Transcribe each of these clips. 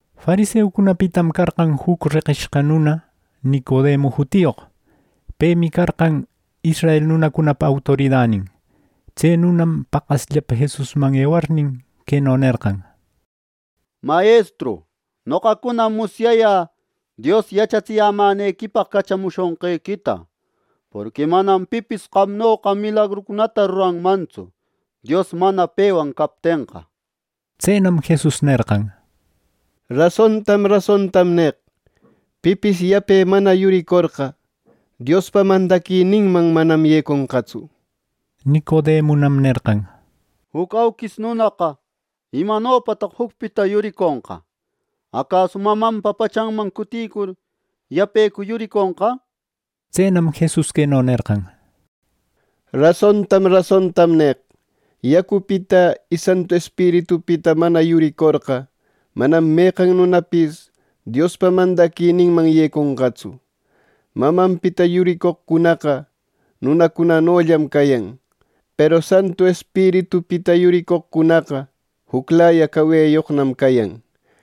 Fariseucunapitam carqan juc reqishqa nuna Nicodemu jutiyoq. Pemi carqan israel nunacunapa autoridanin. Tse nunam paqasllapa Jesusman ewarnin, queno nerqan: —Mayestru, noqacunam musyayä Dios yachatsiyämänequipaq cachamushonqequita, porqui manam pipis qamnoqa milagrucunata ruranmantsu, Dios mana pewan captenqa —nir. Tsenam Jesus nerqan: —Rasontam rasontam neq: Pipis yape mana yuricorqa, Diospa mandaquininman manam yeconqatsu —nir. Nicodemunam nerqan: —Juc auquis nunaqa ¿imanopataq jucpita yuriconqa? ¡Acasu mamanpa pachanman cuticur yapecu yuriconqa! —nir. Tsenam Jesus queno nerqan: —Rasontam rasontam neq: Yacupita y Santu Espiritupita mana yuricorqa, manam meqan nunapis Diospa mandaquininman yeconqatsu. Mamanpita yuricoqcunaqa nunacunanollam cayan. Peru Santu Espiritupita yuricoqcunaqa, juclaya caweyoqnam cayan.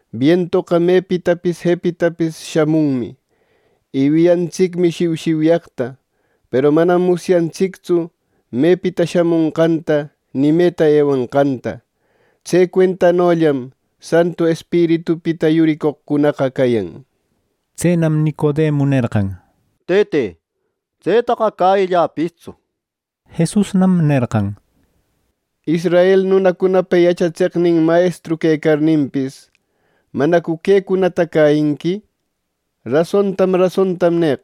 Bientoqa mepeqpis jepeqpis shamunmi, y wiyantsicmi shiushiuyaqta, peru manam musyantsictsu mepita shamonqanta ni meta ewanqanta. Tse cuentanollam Santu Espiritupita yuricoqcunaqa cayan —nir. Tsenam Nicodemu nerqan: —Tëte, ¡Tsetaqa cäyilläpistsu! —nir. Jesusnam nerqan: —Israel nunacunapa yachatseqnin mayestru quecarninpis, ¿manacu quecunata cäyinqui? Rasontam rasontam neq.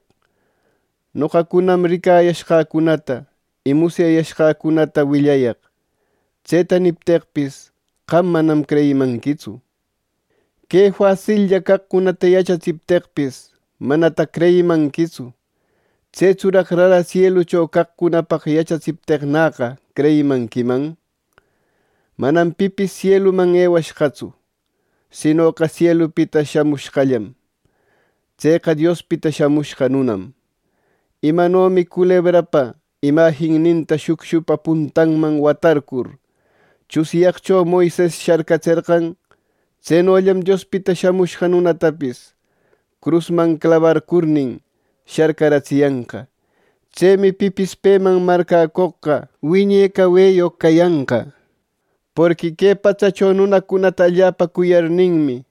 Noqacunam ricayashqäcunata y musyayashqäcunata willayaq. Tseta nipteqpis, qam manam creyimanquitsu. Que fasillla caqcunata yachatsipteqpis, manataq creyimanquitsu; ¿tsetsuraq rara sielucho caqcunapaq yachatsipteqnäqa creyimanquiman? “Manam pipis sieluman ewashqatsu, sinoqa sielupita shamushqallam: tseqa Diospita Shamushqa Nunam. Imanomi culebrapa imajinninta shucshupa puntanman warcurcur, tsunyaqcho Moises sharcatserqan. Tsenollam Diospita Shamushqa Nunatapis crusman clabarcurnin, sharcaratsiyanqa. Tsemi pipis peman marcäcoqqa wiñe caweyoq cayanqa. “Porqui que patsacho nunacunata allapa cuyarninmi,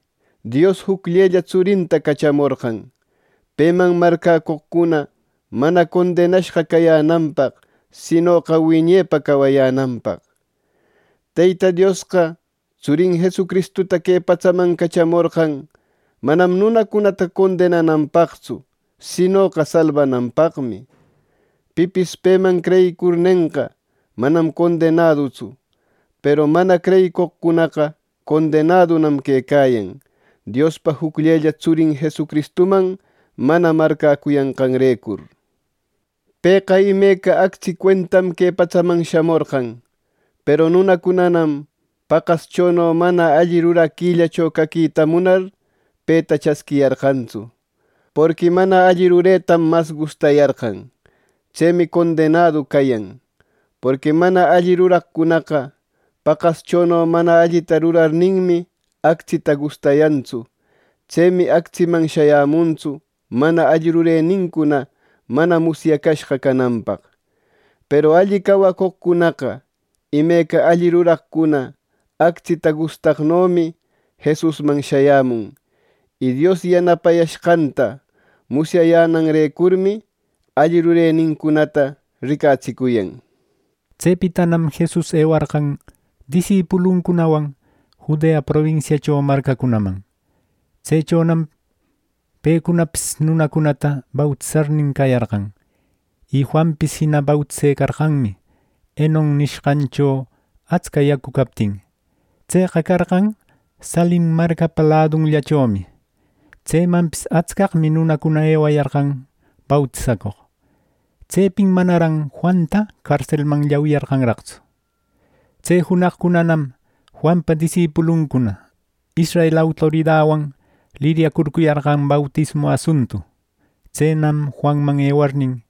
Dios jucllella tsurinta cachamorqan, peman marcäcoqcuna mana condenashqa cayänanpaq sinoqa wiñepa cawayänanpaq. Teyta Diosqa tsurin Jesucristuta que patsaman cachamorqan manam nunacunata condenananpaqtsu, sinoqa salbananpaqmi. Pipis peman creyicurnenqa, manam condenadutsu. Peru mana creyicoqcunaqa condenadunam quecayan, Diospa jucllella tsurin Jesucristuman mana marcäcuyanqanrecur. Pëqa imeca actsi cuentam que patsaman shamorqan. Peru nunacunanam paqaschono mana alli ruraquillacho caquita munar, peta chasquiyarqantsu, porqui mana alli ruretam mas gustayarqan. Tsemi condenadu cayan. Porqui mana alli ruraqcunaqa paqaschono mana allita rurarninmi actsita gustayantsu, tsemi actsiman shayämuntsu, mana alli rurenincuna mana musyacashqa cananpaq. Peru alli cawacoqcunaqa, imeca alli ruraqcuna actsita gustaqnomi, Jesusman shayämun, y Dios yanapayashqanta musyayänanrecurmi alli rurenincunata ricatsicuyan. Tsepitanam Jesus ewarqan disipuluncunawan Judea probinsiacho marcacunaman. Tsechonam pecunapis nunacunata bautisarnin cayarqan. Y Juanpis jina bautisecarqanmi, Enon nishqancho atsca yacu captin. Tseqa carqan Salim marcapa ladunllachomi. Tsemanpis atscaqmi nunacuna ewayarqan bautisacoq. Tsepin manaran Juanta carselman llawiyarqanraqtsu. Tse junaqcunanam Juanpa disipuluncuna israel autoridawan liryacurcuyarqan bautismu asuntu. Tsenam Juanman ewarnin,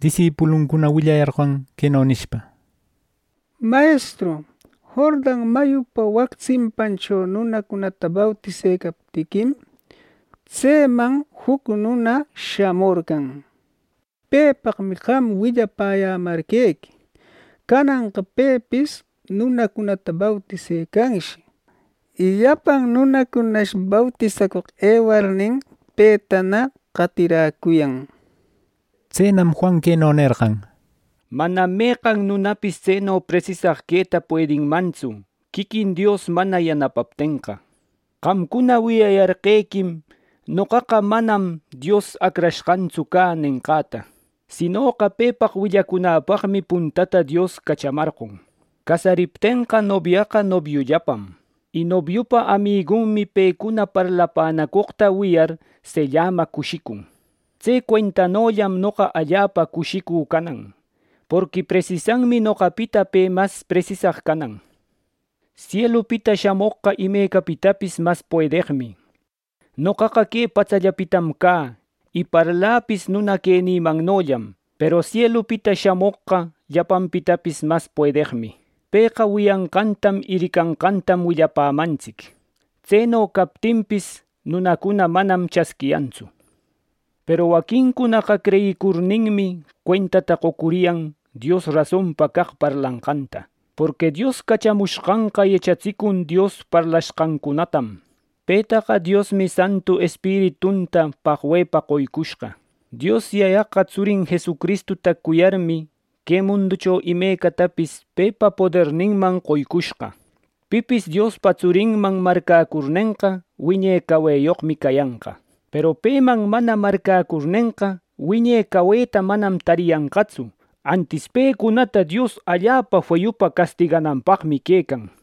disipuluncuna willayarqan queno nishpa: —Mayestru, Jordan mayupa wac tsimpancho nunacunata bautisecaptiquim, tseman juc nuna shamorqan. Pepaqmi qam willapäyämarqequi. Cananqa pepis nunacunata bautisecanshi, y llapan nunacunash bautisacoq ewarnin, petana qatiräcuyan —nir. Tsenam Juan queno nerqan: —Manam meqan nunapis tseno presisaq queta puedinmantsu, quiquin Dios mana yanapaptenqa. Qamcuna wiyayarqequim: ‘Noqaqa manam Dios Acrashqantsu cä’ nenqäta. ‘Sinoqa pepaq willacunäpaqmi puntata Dios cachamarqon.’ Casariptenqa nobiaqa nobiullapam. Y nobiupa amigunmi pecuna parlapänacoqta wiyar, sellama cushicun. Tse cuentanollam noqa allapa cushicü canan. Porqui presisanmi noqapita pe mas presisaq canan. “Sielupita shamoqqa imecapitapis mas puedeqmi. Noqaqa que patsallapitam cä, y parläpis nuna quenïmannollam. Peru sielupita shamoqqa llapanpitapis mas puedeqmi. Pëqa wiyanqantam y ricanqantam willapämantsic. Tseno captinpis, nunacuna manam chasquiyantsu. Peru waquincunaqa creyicurninmi, cuentata qocuriyan Dios rason caq parlanqanta. Porqui Dios cachamushqanqa yachatsicun Dios parlashqancunatam. Petaqa Diosmi Santu Espiritunta paqwepa qoycushqa. Dios Yayaqa tsurin Jesucristuta cuyarmi, que munducho imecatapis pepa poderninman qoycushqa. Pipis Diospa tsurinman marcäcurnenqa wiñe cawayoqmi cayanqa. Peru peman mana marcäcurnenqa, wiñe caweta manam tarenqatsu antis pecunata Dios allapa feyupa castigananpaqmi quecan” nir.